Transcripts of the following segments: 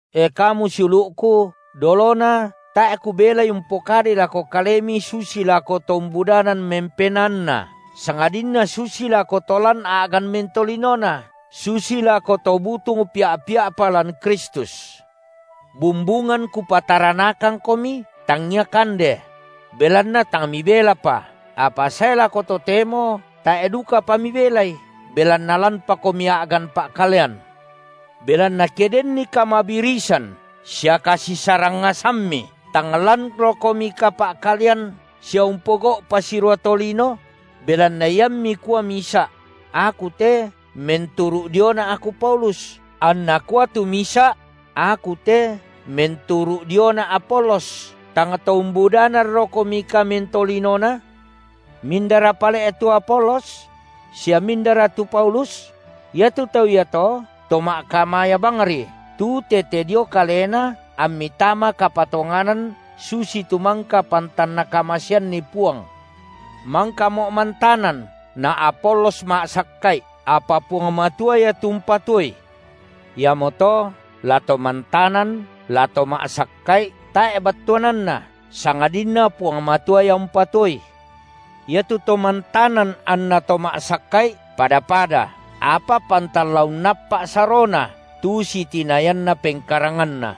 E kamu siulu’ku, dolona tae’ kubelai umpokadai lako kalemi susi lako to umbudanan mempenaanna, sangadinna susi lako to lan a’gan mentolinona, susi lako to butung pia’-pia’pa lan Kristus. Bumbungan kupataranakangkomi tangia kande; belanna tang mibelapa, apa sae lako totemo tae’ dukapa mibelai, belanna lanpakomi a’gan pa’kalean. Belanna ke denni kamabirisan sia kasisarangngasammi, tang lanrokomika pa’kalean sia umpogau’ pasirua tolino? Belanna iammi kua misa’: Aku te menturu’ diona’ aku Paulus, anna kua tu misa’: aku te menturu’ diona’ Apolos, tang to umbudananrokomika mentolinona? Passanan tengkona to mangkambi’ Mindara pale’ tu Apolos? Sia mindara tu Paulus? Iatu tau iato to ma’kamaya bangri, tu tete dio kalena ammi tama kapatonganan susitu mangka pantan Nakamaseanni Puang. Mangkamo’ mantanan na Apolos ma’sakka’i, apa Puang Matua Ia tu umpatuoi. Iamoto, la to mantanan, la to ma’sakka’i tae’ battuananna, sangadinna Puang Matua Ia umpatuoi. Iatu to mantanan anna to ma’sakka’i pada-pada, apa pantan la unnappa’ sarona, tu sitinayanna pengkaranganna.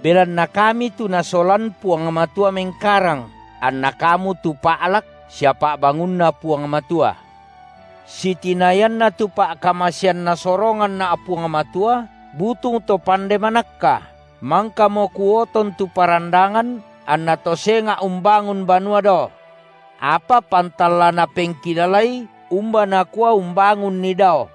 Belanna kami tu Nasolan Puang Matua mengkarang, anna kamu tu pa’lak sia pa’bangunNa Puang Matua. Sitinayanna tu pa’kamasean Nasoronganna’ Puang Matua, butung to pande manakka, mangkamo kuoton tu parandangan, anna to senga’ umbangun banua dao. Apa pantan la napengkilalai umba nakua umbangunni dao.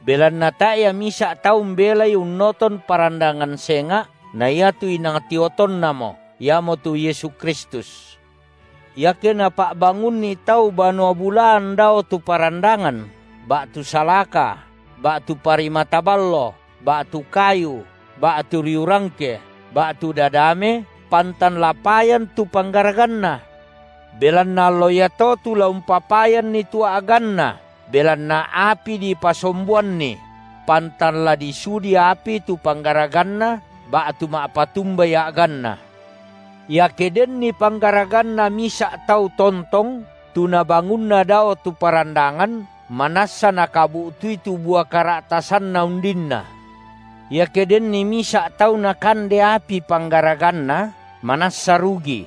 Belanna tae’ ia misa’ tau umbelai unnoton parandangan senga’ na iatu inang tiotonnamo, Iamotu Yesu Kristus. Iake napa’bangunni tau banua bulaan dao tu parandangan, ba’tu salaka, ba’tu parimata ballo, ba’tu kayu, ba’tu riu rangke, ba’tu dadame, pantan la payan tu panggaraganna. Belanna allo iato tu la umpapayanni tu a’ganna belanna api dipasomboanni; pantan la disudi api tu panggaraganna ba’tu ma’patumbai a’ganna. Iake denni panggaraganna misa’ tau tontong, tu nabangunna dao tu parandangan, manassa nakabu’tui tu bua kara’tasanna undinna. Iake denni misa’ tau nakande api panggaraganna, manassa rugi.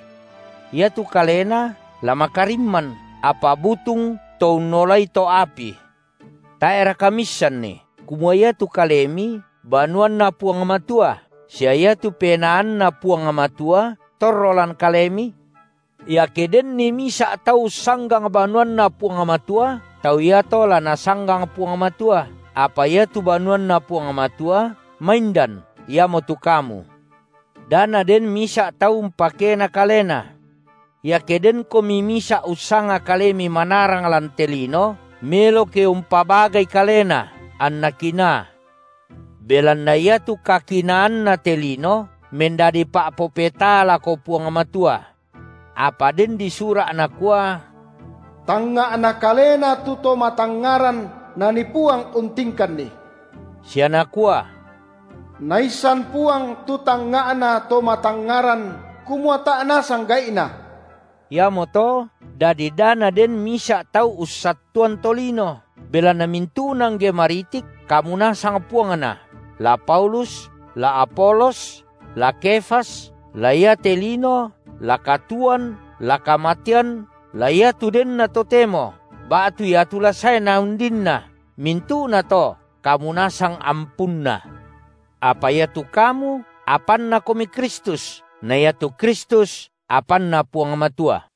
Iatu kalena la makarimman, apa butung to unnolai to’ api. Tae’raka miissanni kumua iatu kalemi banuanNa Puang Matua, sia iatu PenaanNa Puang Matua torro lan kalemi? Iake denni misa’ tau ussanggang banuanNa Puang Matua, tau iato la Nasanggang Puang Matua, apa iatu banuanNa Puang Matua maindan iamotu kamu. Da naden misa’ tau umpakena kalena. Iake denkomi misa’ ussanga kalemi manarang lan te lino, melo ke umpabagai kalena, anna kinaa. Belanna iatu kakinaanna te lino mendadi pa’popetaa lako Puang Matua. Apa den disura’ nakua: Tangnga’na kalena tu to matangngaran Nanii Puang untingkanni. Sia nakua: Naissan Puang tu tangnga’na to matangngaran kumua tae’ nasang gai’na. Iamoto dadi da naden misa’ tau ussattuan tolino. Belanna mintu’na angge maritik kamu nasang puangna, la Paulus, la Apolos la Kefas, la iate lino, la katuoan, la kamatean, la iatu denna totemo, ba’tu iatu la saena undinna, mintu’nato kamu nasang ampunna. Apa iatu kamu apannakomi Kristus, na iatu Kristus apanNa Puang Matua.